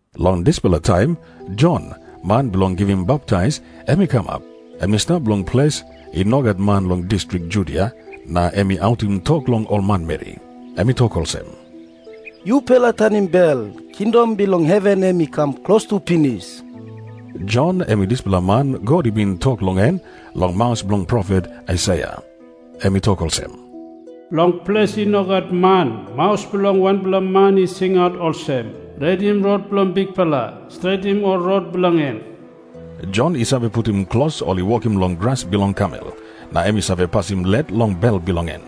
Long dispela taim Jon, man bilong givim baptais, em i kamap. Em i stap long ples i no gat man long distrik Judia, na em i autim tok long ol manmeri. Em i tok olsem, “Yupela tanim bel. Kingdom bilong heven em i kam klostu pinis.” Jon em i dispela man God i bin tok long en long maus bilong profet Aisaia. Em i tok olsem, “Long ples i no gat man, maus bilong wanpela man i singaut olsem, ‘Redim rot bilong Bikpela. Stretim ol rot bilong en.’” Jon i save putim klos ol i wokim long gras bilong kamel, na em i save pasim let long bel bilong en.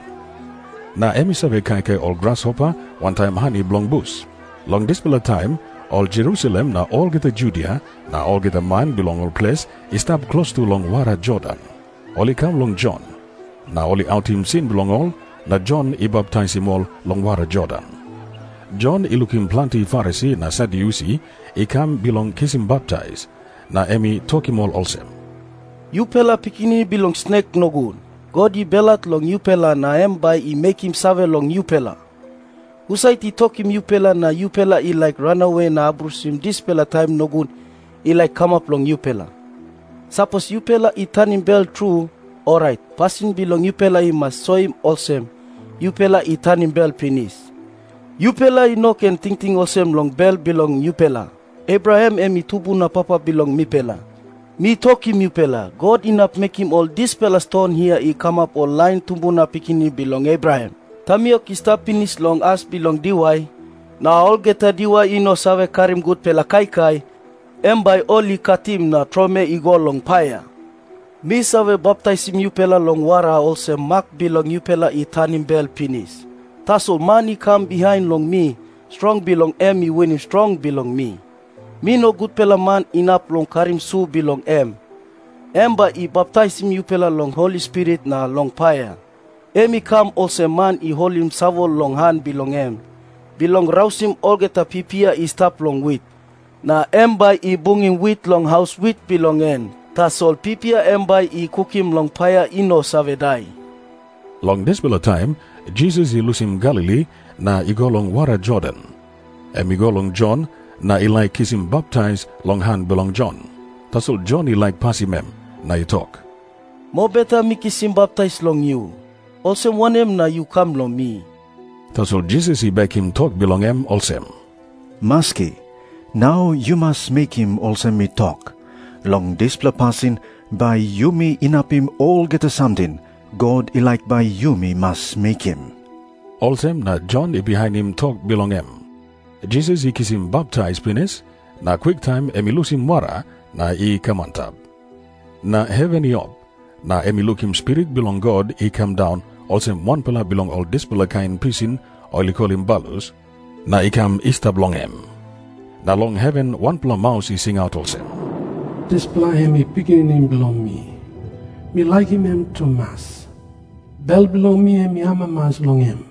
Na em i save kaikai ol grasopa wantaim hani bilong bus. Long dispela taim ol Jerusalem na olgeta Judia na olgeta man bilong ol ples i stap klostu long wara Jordan, ol i kam long Jon. Na ol i autim sin bilong ol, na Jon i baptaisim ol long wara Jordan. Jon i lukim planti Farisi na Sadyusi i kam bilong kisim baptais, na em i tokim ol olsem, “Yupela pikinini bilong snek nogut, God i belhat long yupela na em bai i mekim save long yupela. Husat i tokim yupela na yupela i laik ranawe na abrusim dispela taim nogut i laik kamap long yupela? Sapos yupela i tanim bel tru, orait pasin bilong yupela i mas soim olsem yupela i tanim bel pinis. Yupela i no ken tingting olsem long bel bilong yupela, ‘Abraham em i tumbuna papa bilong mipela.’ Mi tokim yupela, God inap mekim ol dispela ston hia i kamap ol lain tumbuna pikinini bilong Abraham. Tamiok i stap pinis long as bilong diwai, na olgeta diwai i no save karim gutpela kaikai, em bai ol i katim na tromoi i go long paia. “Mi save baptaisim yupela long wara olsem mak bilong yupela i tanim bel pinis. Tasol man i kam bihain long mi, strong bilong en i winim strong bilong mi. Mi no gutpela man inap long karim su bilong em. Em bai i baptaisim yupela long Holi Spirit na long paia. Em i kam olsem man i holim savol long han bilong en, bilong rausim olgeta pipia i stap long wit. Na em bai i bungim wit long haus wit bilong en. Tasol pipia em bai i kukim long paia i no save dai.” Long dispela taim Jisas i lusim Galili na i go long wara Jordan. Em i go long Jon, na i laik kisim baptais long han bilong Jon. Tasol Jon i laik pasim em, na i tok, “Mobeta mi kisim baptais long yu. Olsem wanem na yu kam long mi?” Tasol Jisas i bekim tok bilong em olsem, “Maski, nau yu mas mekim olsem mi tok. Long dispela pasin bai yumi inapim olgeta samting God i laik bai yumi mas mekim.” Olsem na Jon i bihainim tok bilong em. Jisas i kisim baptais pinis, na kwiktaim em i lusim wara na i kam antap. Na heven i op, na em i lukim Spirit bilong God i kam daun olsem wanpela bilong ol dispela kain pisin ol i kolim balus, na i kam i stap long em. Na long heven wanpela maus i singaut olsem, “Dispela em i Pikinini bilong mi. Mi laikim em tumas. Bel bilong mi em i amamas long em.”